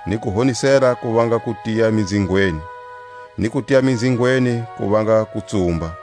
ni kuhonisela ku vanga kutiya minzhingweni, ni kutiya minzhingweni ku vanga kutsumba.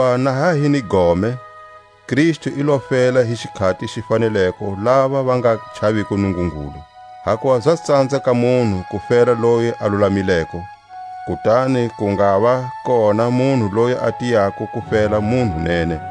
Hakuva na ha hi ni gome, Kristu i lo fela hi xikhati xi faneleko lava va nga chaviko Nungungulu. Hakuva za tsanza ka munhu ku fela loyi a lulamileko, kutani ku ngava kona munhu loyi a tiyako ku fela munhu nene.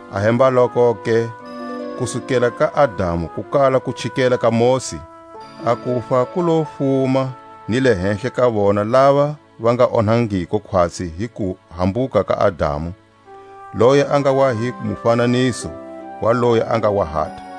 Ahembalokoke, kusukela ka Adamu ku kala ku chikela ka Mosi, a kufa ku lo fuma ni le hehla ka vona lava va nga onhangiko khwatsi hi kuhambuka ka Adamu, loyi a nga wa hi mufananiso wa loyi a nga wa hata.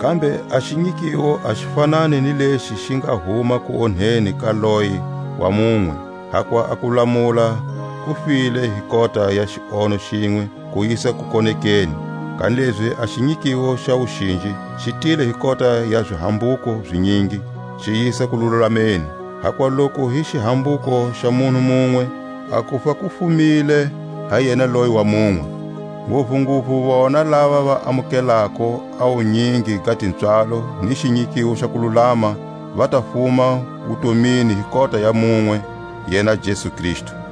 Kambe a xinyikiwo a xi fanani ni lexi xi nga huma kuonheni ka loye wa munwe. Hakuva a kulamula ku tile hi kota ya xionho xinwe ku yisa kukonekeni, kanilezi a xinyikiwo xa wuxinji xi tile hi kota ya zihambuko zinyingi, xi yisa kululameni. Hakuva loku hi xihambuko xa munhu munwe a kufa ku fumile ha yena loye wa munwe; nguvunguvu vona lava va amukelako a wunyingi ga tipswalo ni xinyikiwo xa kululama va ta fuma wutomini hi kota ya munwe, yena Jesu Kristu.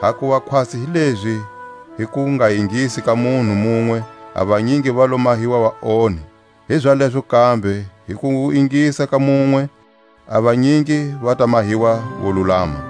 Hakuva khwatsi hi lezi hi kungaingisi ka munhu munwe a vanyingi va lo mahiwa vaonhi, hizalezo kambe hi kuingisa ka munwe a vanyingi va ta mahiwa volulama.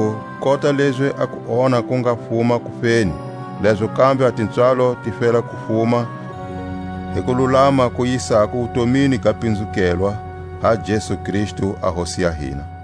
lezaku kota lezi a kuonha ku nga fuma kufeni, lezo kambe a tipswalo ti fela ku fuma hi kululama ku yisako wutomini ga pinzukelwa ha Jesu Kristu a Hosi ya hina.